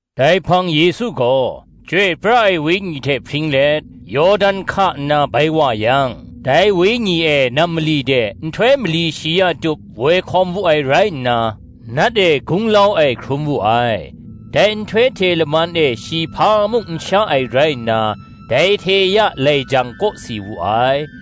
Dai hpang Yesu gaw, Chyoi pra ai Wenyi hte hpring let, Yawdan hka nna bai wa yang, dai Wenyi e nam mali de nhtoi mali shi ya tup woi hkawm wu ai rai nna, Nat e gunglau ai hkrum wu ai. Dai nhtoi hte laman e shi hpa mung n sha ai rai nna dai hte ya lai jang kawsi wu ai.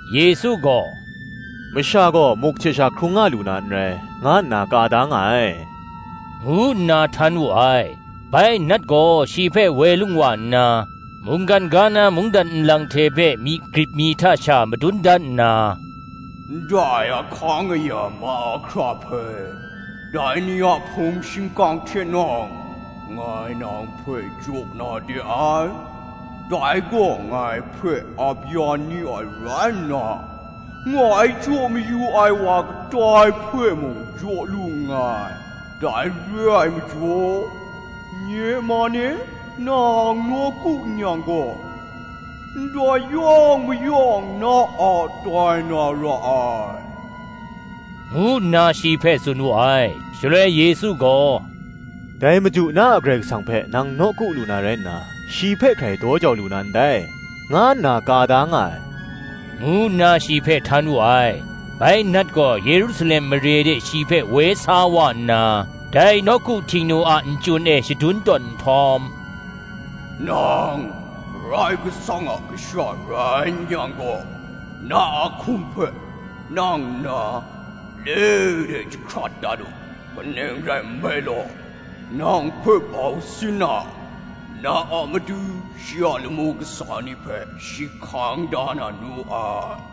Yesu gaw, “Masha gaw muk hte sha hkrung nga lu na n rai, nga nna ka da nga ai,” ngu nna htan wu ai. Bai Nat gaw, shi hpe woi lung wa nna, mungkan ga na mungdan nlang hpe myi grip mi hta sha madun dan nna, Ndai ahkang aya mahkra hpe, dai ni a hpung shingkang hte nawng, ngai nang hpe jaw na de ai; dai gaw ngai hpe ap ya ni ai rai nna, ngai jaw mayu ai wa kadai hpe mung jaw lu nngai: dai re ai majaw, nye man e nang nawku n yang gaw, ndai yawng mayawng na a tai na ra ai, ngu nna shi hpe tsun wu ai. Shaloi Yesu gaw, “Dai Madu na a Karai Kasang hpe nang nawku lu na rai nna, shi hpe hkrai daw jau lu na ndai, nga nna ka da nga ai,” ngu nna shi hpe htan wu ai. Bai Nat gaw Yerusalem mare de shi hpe woi sa wa nna, dai Nawku Htingnu a nchyun e shadun tawn nhtawm, “Nang Karai Kasang a Kasha rai n-yang gaw, na a hkum hpe nang nna le de jahkrat dat u; kaning rai nme law, “Nang hpe bau sin na, na a matu shi a lamu kasa ni hpe shi hkang da na nu ai.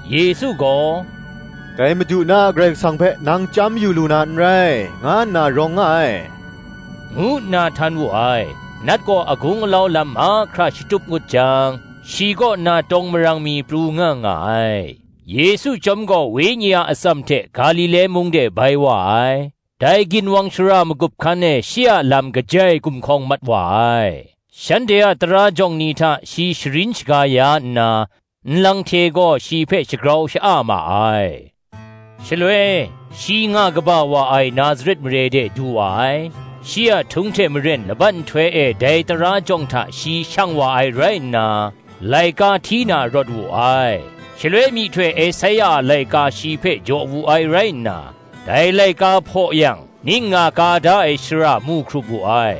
Yesu gaw, “Dai Madu na a Karai Kasang hpe nang chyam yu lu na n rai, nga nna rawng nga ai,” ngu nna htan wu ai. Nat gaw agung alau lam mahkra shatup ngut jang, shi kaw na tawng marang mi pru nga nga ai. Yesu chyawm gaw Wenyi a atsam hte Galile mung de bai wa ai. Dai ginwang shara magup hkan e shi a lam kajai gumhkawng mat wa ai. Shanhte a tara jawng ni hta shi sharin shaga ya nna, nlang hte gaw shi hpe shagrau sha-a ma ai. Shaloi, shi nga kaba wa ai Nazaret mare de du wa ai; shi a htung hte maren laban nhtoi e dai tara jawng hta shi shang wa ai rai nna, laika hti na rawt wu ai. Shaloi myihtoi Esaia a laika shi hpe jaw wu ai rai nna, dai laika hpaw yang, ning nga ka da ai shara mu hkrup wu ai;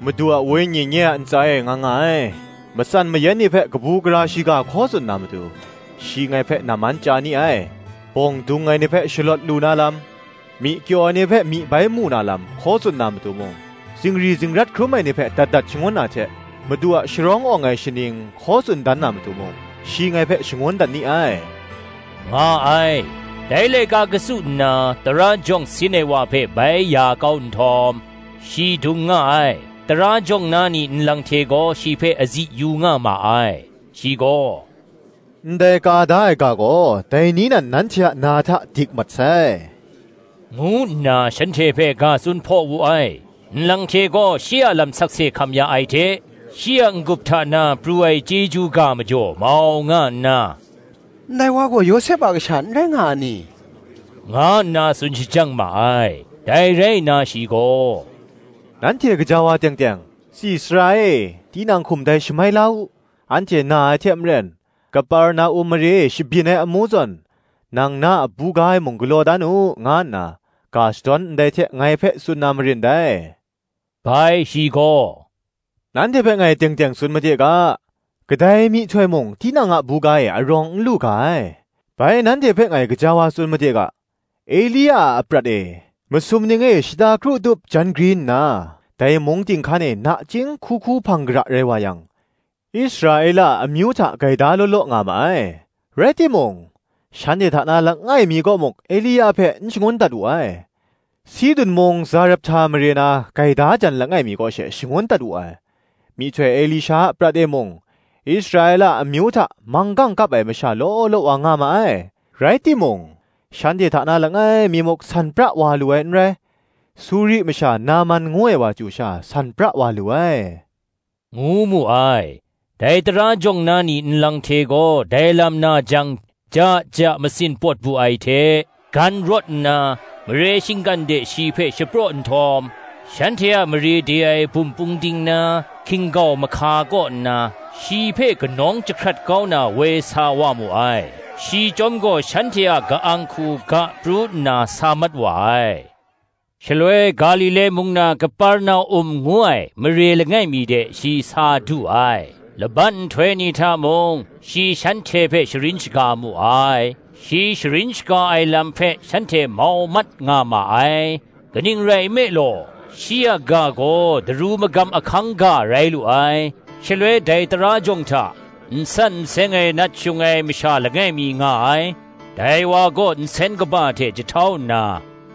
“Madu a Wenyi nye a ntsa e nga nga ai: Matsan mayan ni hpe kabu gara shiga hkaw tsun na matu, shi ngai hpe namman chya ni ai: Bawng dung ai ni hpe shalawt lu na lam, Myi kyaw ai ni hpe myi bai mu na lam, hkaw tsun na matu mung, Zingri zingrat hkrum ai ni hpe dat dat shangun na hte, Madu a sharawng awng ai shaning hkaw tsun dan na matu mung, shi ngai hpe shangun dat ni ai,” nga ai. Dai laika katsu nna, tara jawng sin ai wa hpe bai ya kau nhtawm, shi dung nga ai: tara jawng na ni nlang hte gaw shi hpe azi yu nga ma ai. Shi gaw, “Ndai ka da ai ga gaw dai ni nan nanhte a na hta dik mat sai,” ngu nna shanhte hpe ga tsun hpaw wu ai. Nlang hte gaw shi a lam sakse hkam ya ai hte, shi a n-gup hta na pru ai chyeju ga majaw mau nga nna, “Ndai wa gaw Yawsep a kasha n rai nga a ni?” nga nna tsun shajang ma ai. Dai rai nna shi gaw, “Nanhte gaja wa teng teng, Tsi sara e, tinang hkum dai shamai la u; anhte na ai hte maren, Kaperna-um mare e shabyin ai amu zawn, nang na a buga e mung galaw dan u,” nga nna ga shadawn ndai hte ngai hpe tsun na marin dai. Bai shi gaw, “Nanhte hpe ngai teng teng tsun made ga, Kadai myihtoi mung tinang buga e arawng n lu ga ai. Bai nanhte hpe ngai gaja wa tsun made ga, Elia a aprat e, masum ning e shata kru tup jan gri nna, dai mung ting hkan e nachying hku hku hpang gara rai wa yang, Israela a amyu hta gaida law law nga ma ai: rai timung, shanhte hta na langai mi kaw muk Elia hpe n shangun dat wu ai; Sidun mung Zarephta mare na gaida jan langai mi kaw she shangun dat wu ai. Myihtoi Elisha a aprat e mung, Israela a amyu hta manggang kap ai masha law law wa nga ma ai, rai timung, shanhte hta na langai mi muk san pra wa lu ai n rai; Suri masha Naman ngu ai wa chyu sha san pra wa lu ai,” ngu mu ai. Dai tara jawng na ni nlang hte gaw dai lam na jang, ja ja masin pawt bu ai hte, gan rawt nna, mare shinggan de shi hpe shapraw nhtawm, shanhte a mare de ai bum pungding na hkin-gau mahka kaw nna, shi hpe kanawng jahkrat kau na woi sa wa mu ai. Shi chyawm gaw shanhte a ka-ang hku ga pru nna sa mat wa ai. Shaloi Galile mung na Kaperna-um ngu ai mare langai mi de shi sa du ai. Laban nhtoi ni hta mung shi shanhte hpe sharin shaga mu ai; shi sharin shaga ai lam hpe shanhte mau mat nga ma ai: kaning rai nme law, shi a ga gaw daru magam ahkang ga rai lu ai. Shaloi dai tara jawng hta, n san n seng ai nat shung ai masha langai mi nga ai: dai wa gaw nsen kaba hte jahtau nna,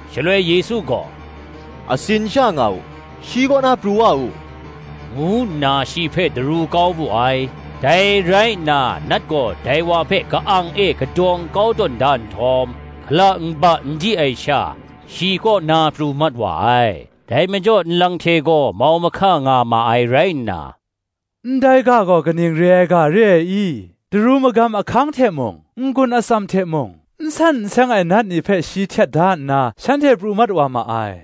Shaloi Yesu gaw, “Atsin sha nga u, shi kaw na pru wa u,” ngu nna shi hpe daru kau wu ai. Dai rai nna Nat gaw dai wa hpe ka-ang e kadawng kau tawn da nhtawm, hkala nba n di ai sha, shi kaw na pru mat wa ai. Dai majaw nlang hte gaw mau mahka nga ma ai rai nna, “Ndai ga gaw kaning re ai ga re ai i? daru magam ahkang hte mung, n-gun atsam hte mung, n san n seng ai nat ni hpe shi htet da nna shanhte pru mat wa ma ai,”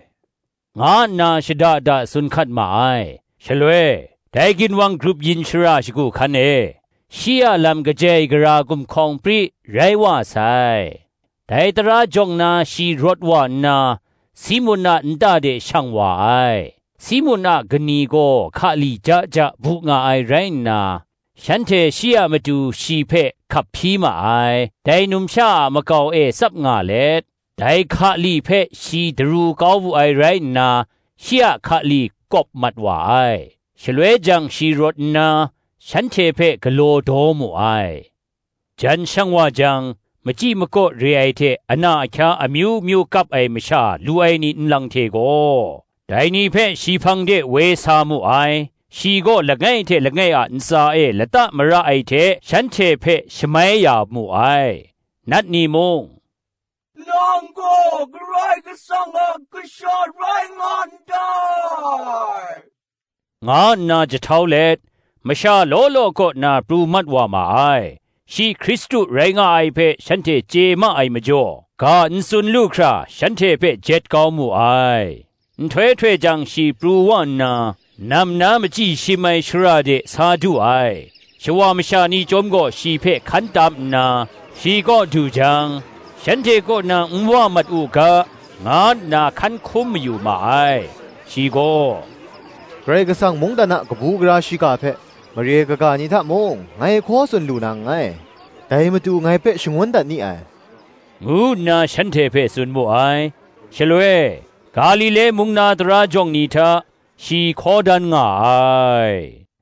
nga nna shada da tsun hkat ma ai. Shaloi, dai ginwang grup yin shara shagu hkan e, shi a lam kajai gara gumhkawng pri rai wa sai. Dai tara jawng na shi rawt wa nna, Simun a nta de shang wa ai. Simun a kani gaw hkali ja ja bu nga ai rai nna, shanhte shi a matu shi hpe hkap hpyi ma ai. Dai numsha a makau e tsap nga let, dai hkali hpe shi daru kau wu ai rai nna, shi a hkali kawp mat wa ai: shaloi jang shi rawt nna, shanhte hpe galaw daw mu ai. Jan shang wa jang, machyi makaw re ai hte ana ahkya amyu myu kap ai masha lu ai ni nlang hte gaw, dai ni hpe shi hpang de woi sa mu ai; shi gaw langai hte langai a ntsa e lata mara ai hte shanhte hpe shamai ya mu ai. Nat ni mung, “Nang gaw Karai Kasang a Kasha rai nga ndai,” nga nna jahtau let masha law law kaw na pru mat wa ma ai: shi Hkristu rai nga ai hpe shanhte chye ma ai majaw, ga n tsun lu hkra, shanhte hpe jet kau mu ai. Nhtoi htoi jang shi pru wa nna, nam na machyi shim ai shara de sa du ai. Shawa masha ni chyawm gaw shi hpe hkan tam nna, shi kaw du jang, shanhte kaw na n wa mat u ga, nga nna hkan hkum mayu ma ai. Shi gaw, “Karai Kasang mungdan a kabu gara shiga hpe, mare kaga ni hta mung ngai hkaw tsun lu na nngai; dai matu ngai hpe shangun dat ni ai,” ngu nna shanhte hpe tsun mu ai. Shaloi, Galile mung na tara jawng ni hta, shi hkaw dan nga ai.